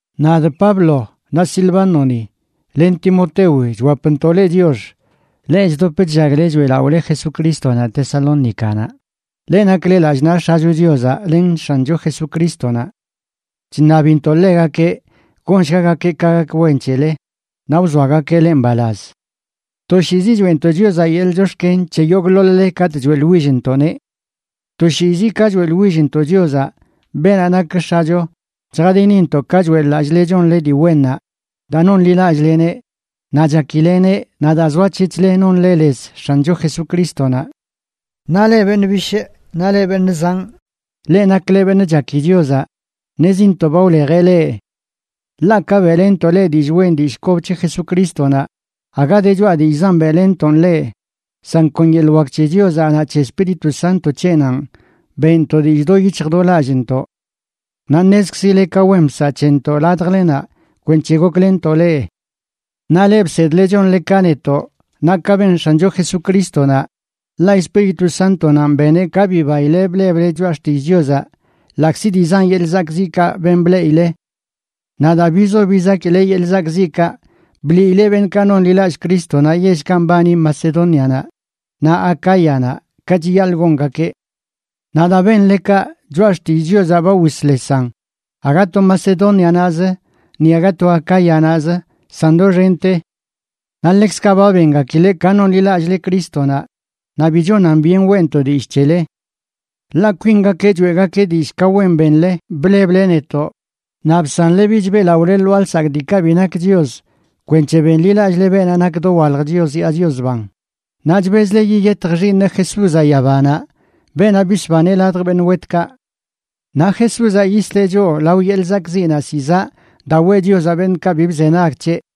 Nadꞌ Pablo naꞌ Silvánoni len Timotewi chwapntoꞌ leꞌ chiox, leꞌ chdop chllagle choeꞌlaꞌole Jesucrístonaꞌ Tesalónicanaꞌ, leꞌ nakle lallꞌ naꞌ X̱acho Chiozaꞌ len X̱ancho Jesucrístonaꞌ. Chṉabintoꞌ ḻegakeꞌ gonshgagakeꞌ ka gak wen c̱hele, naꞌ wzoagakeꞌ leꞌ mbalaz. Toshiizi choeꞌntoꞌ Chiozaꞌ yeḻꞌ chox̱ken c̱he yogꞌḻoḻ-le katꞌ choeꞌḻwillntoꞌneꞌ. Toshiizi ka choeꞌḻwillntoꞌ Chiozaꞌ, beenaꞌ nak X̱acho, chjadinintoꞌ ka choeꞌḻ-lallꞌle chonle dii wennaꞌ daa nonḻilallꞌleneꞌ naꞌ chakileꞌneꞌ, naꞌ daa zoac̱hec̱hle nonle lez X̱ancho Jesucrístonaꞌ. Naꞌ leꞌ beṉꞌ bishꞌ naꞌ leꞌ beṉꞌ zanꞌ, leꞌ nakle beṉꞌ chaki Chiozaꞌ, ṉezintoꞌ ba wlejeꞌ leꞌ. Ḻaꞌ ka beꞌlenntoꞌ leꞌ dillꞌ wen dillꞌ kob c̱he Jesucrístonaꞌ, aga de choꞌa dillꞌzan beꞌlenntoꞌn leꞌ, san kon yeḻꞌ wak c̱he Chiozaꞌ naꞌ c̱he Espíritu Sánto c̱heꞌnanꞌ beꞌntoꞌ dillꞌ do yic̱hj do lallꞌntoꞌ. Naꞌ ṉezkzile ka wen bsaꞌ c̱hentoꞌ ladjlenaꞌ kwenc̱he goklenntoꞌ leꞌ. Naꞌ leꞌ bsedle chonle ka netoꞌ naꞌ ka ben X̱ancho Jesucrístonaꞌ, ḻaꞌ Espíritu Sántonanꞌ beneꞌ ka bibaile bleble Choꞌa xtill Chiozaꞌ ḻaꞌkzi dii zan yeḻꞌ zakꞌziꞌkaꞌ ben bleꞌile. Naꞌ daa bizo bizakile yeḻꞌ zakꞌziꞌkaꞌ, bliile beṉꞌkaꞌ nonḻilallꞌ Crístonaꞌ yellkaꞌ mbani Macedónianaꞌ naꞌ Acáyanaꞌ ka chiyaḻꞌ gongakeꞌ. Naꞌ daa benle kaꞌ, Choꞌa xtillꞌ Chiozaꞌ ba wisḻesan aga to Macedónianaꞌzə, ni aga to Acáyanaꞌzə, san doxente. Naꞌ ḻekzkaꞌ ba bengakile ka nonḻilallꞌle Crístonaꞌ, naꞌ bi chonan byen weꞌnto dillꞌ c̱hele. Ḻaꞌ kwingakeꞌ choeꞌgakeꞌ dillꞌ ka wen benle bleble netoꞌ, naꞌ bsanle bich beꞌlaꞌole lwaa lsakꞌ diikaꞌ bi nak chios kwenc̱he benḻilallꞌle beenaꞌ nak dowalj Chios yaa Chios ban, naꞌ chbezle yiyetj Xiiṉeꞌ Jesúzaꞌ yabanaꞌ, beenaꞌ bisbaneꞌ ladj beṉꞌ wetkaꞌ. Naꞌ Jesúzaꞌ yisleꞌ choꞌ lao yeḻꞌ zakꞌziꞌnaꞌ zizaꞌ daa weꞌ Chiozaꞌ beṉꞌkaꞌ bi bzenag c̱heꞌ.